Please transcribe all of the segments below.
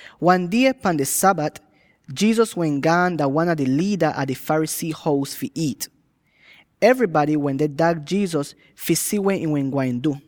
Wan die, pan di Sabat, Jesus wehn gaan dah wan a di liida a di Pharisee hous fi iit. Evrybady wende dag Jesus fi si weh ihn wehn gwain du.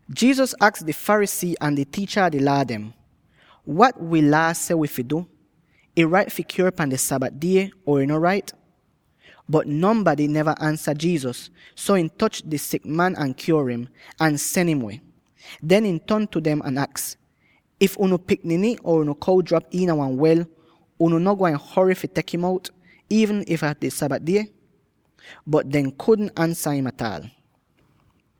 Jesus aks di Pharisee ahn di tiicha a di Laa dem, “Wat wi Laa seh wi fi du; ih rait fi kyuor pan di Sabat die or ih no rait?” Bot nonbady neva ansa Jesus, so ihn toch di sik man ahn kyuor im, ahn sen im weh. Den ihn ton tu dem ahn aks, “If unu pikniny or unu kow drap iina wan wel, unu no gwain hory fi tek im out, iivn if dah di Sabat die?” Bot dehn kudn ansa im ataal.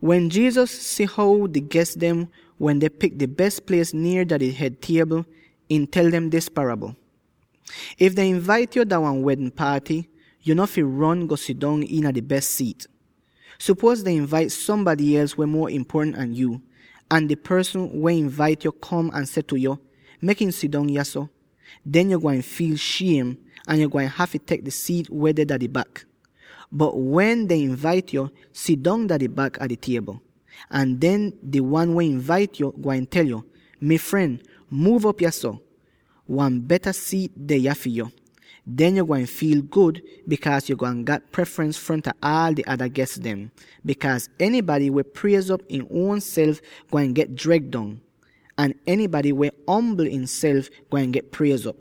Wen Jesus si how di ges dem wende pik di bes plies nier di hed tiebl, ihn tel dem dis parabl: “If dehn invait yo dah wan wedn paaty, yo no fi ron, go sidong iina di bes siit. Supuoz dehn invait sombady els weh muo impuotant an yuu, ahn di porsn weh invait yo kom ahn seh tu yo, ‘Mek im sidong yahso.’ Den yo gwain fiil shiem, ahn yo gwain hafy tek di siit weh deh dah di bak! Bot, wen dehn invait yo, sidong dah di bak a di tiebl. Ahn den di wan weh invait yo gwain tel yo, ‘Mi fren, muuv op yahso; wan beta siit deh yah fi yo!’ Den yo gwain fiil gud, bikaaz yo gwain gat preferens fronta aal di ada ges dem, bikaaz enybady weh priez'op im uonself, gwain get dreg dong. Ahn enybady weh ombl ihnself, gwain get priez'op.”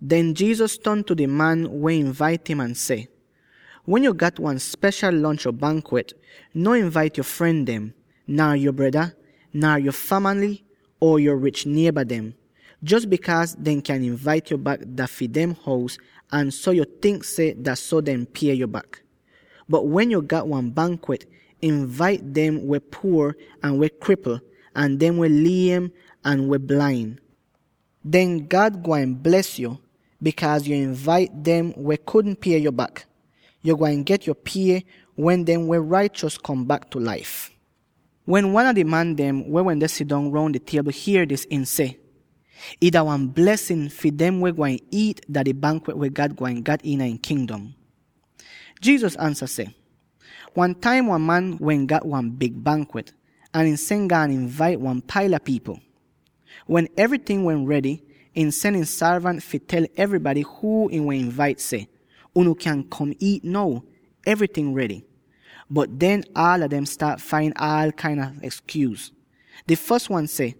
Den Jesus ton tu di man weh invait im ahn seh, “Wen yo gat wan speshal lonch or bankwet, no invait yo fren dem, nar yo breda, nar yo famaly or yo rich nieba dem; jos bikaaz dehn kyan invait yo bak dah fi dem hous, ahn so yo tink seh dah so dehn deh pie yo bak. Bot wen yo gat wan bankwet, invait dem weh puor ahn weh kripl, ahn dem weh liem ahn weh blain. Den God gwain bles yo, bikaaz yo invait dem weh kudn pie yo bak. Yo gwain get yo pie wen dem weh raichos kom bak tu laif.” Wen wan a di man dem weh wende sidong roun di tiebl hier dis, ihn seh, “Ih dah wan blesin fi dem weh gwain iit iina di bankwet weh God gwain gat iina ihn Kingdom!” Jesus ansa seh, “Wan taim wan man wehn gat wan big bankwet ahn ihn sen gaan invait wan paila pipl. Wen evryting wehn redy, ihn sen ihn sorvant fi tel evrybady huu ihn wehn invait seh, ‘Unu kyan kom iit now; evryting redy.’ Bot den, aala dem staat fain aal kain a ekskyuus: Di fos wan seh,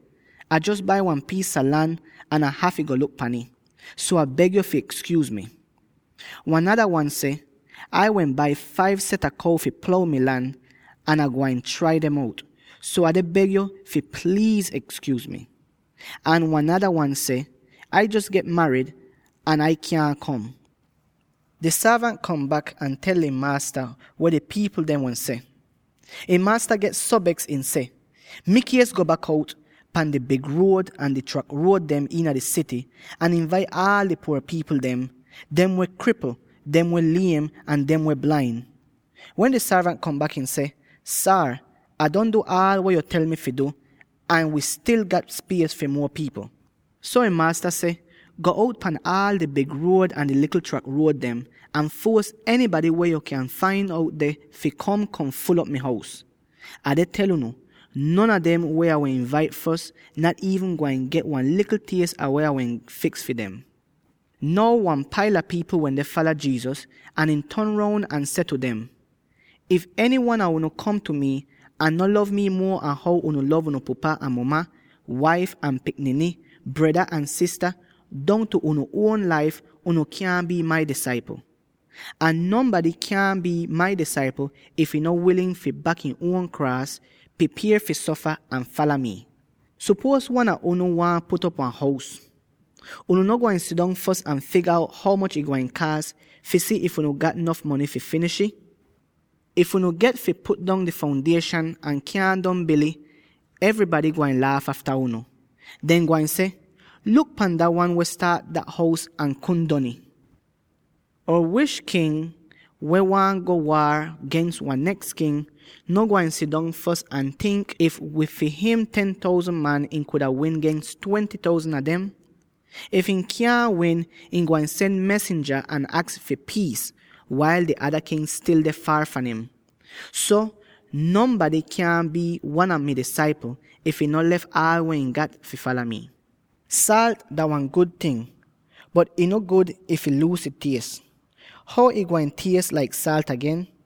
‘Ai jos bai wan piis a lan, ahn Ah hafy go luk pan ih. So Ah beg yo fi ekskyuuz mi.’ Wan nada wan seh, ‘Ai wehn bai five set a kow fi plow mi lan, ahn Ah gwain trai dem out; so Ah deh beg yo fi pliiz ekskyuuz mi.’ Ahn wan nada wan seh, ‘Ai jos get marid, ahn Ai kyaahn kom.’ “Di sorvant kom bak ahn tel ihn maasta weh di pipl dem wehn seh. Ihn maasta get so beks, ihn seh, ‘Mikies, go bak out pan di big ruod ahn di trak ruod dem iina di sity, ahn invait aal di puor pipl dem —dem weh kripl, dem weh liem, ahn dem weh blain.’ Wen di sorvant kom bak, ihn seh, ‘Saar, Ah don du aal weh yo tel mi fi du, ahn wi stil gat spies fi muo pipl.’ So ihn maasta seh, ‘Go out pan aal di big ruod ahn di likl trak ruod dem, ahn fuos enybady weh yo kyan fain out deh fi kom, kom ful'op mi hous.’ Ah deh tel unu: non a dem weh Ah wehn invait fos nat iivn gwain get wan likl ties ah weh Ah wehn fiks fi dem.” Now wan paila pipl wende fala Jesus, ahn ihn ton roun ahn seh tu dem, “If enywan a unu kom tu mi, ahn no lov mi muo an how unu lov unu pupa ahn muma, waif ahn pikniny, breda ahn sista, dongtu unu uon laif, unu kyaahn bii mai disaipl. Ahn nonbady kyaahn bii mai disaipl, if ihn no wilin fi bak ihn uon kraas —pripier fi sofa— ahn fala mi. Sopuoz wan a unu waahn put op wan hous. Yuu no gwain sidong fos ahn figa out ho moch ih gwain kaas, fi si if unu gat nof mony fi finish'ih? If unu get fi put dong di foundieshan ahn kyaahn don bil'ih, evrybady gwain laaf afta unu. Dehn gwain seh, ‘Luk pan dah wan weh staat dat hous ahn kudn don ih!’ Or wish king weh waahn go waar gens wan neks king, no gwain sidong fos ahn tink if wid fi him ten thousand man ihn kuda win gens twenty thousand a dem? If ihn kyaahn win, ihn gwain sen mesinja ahn aks fi piis, wail di ada king stil deh faar fahn im. So, nonbady kyaahn bii wan a mai disaipl, if ihn no lef aal weh ihn gat fi fala mi. “Saalt dah wan gud ting, bot ih no gud if ih luuz ih ties; how ih gwain ties laik saalt agen?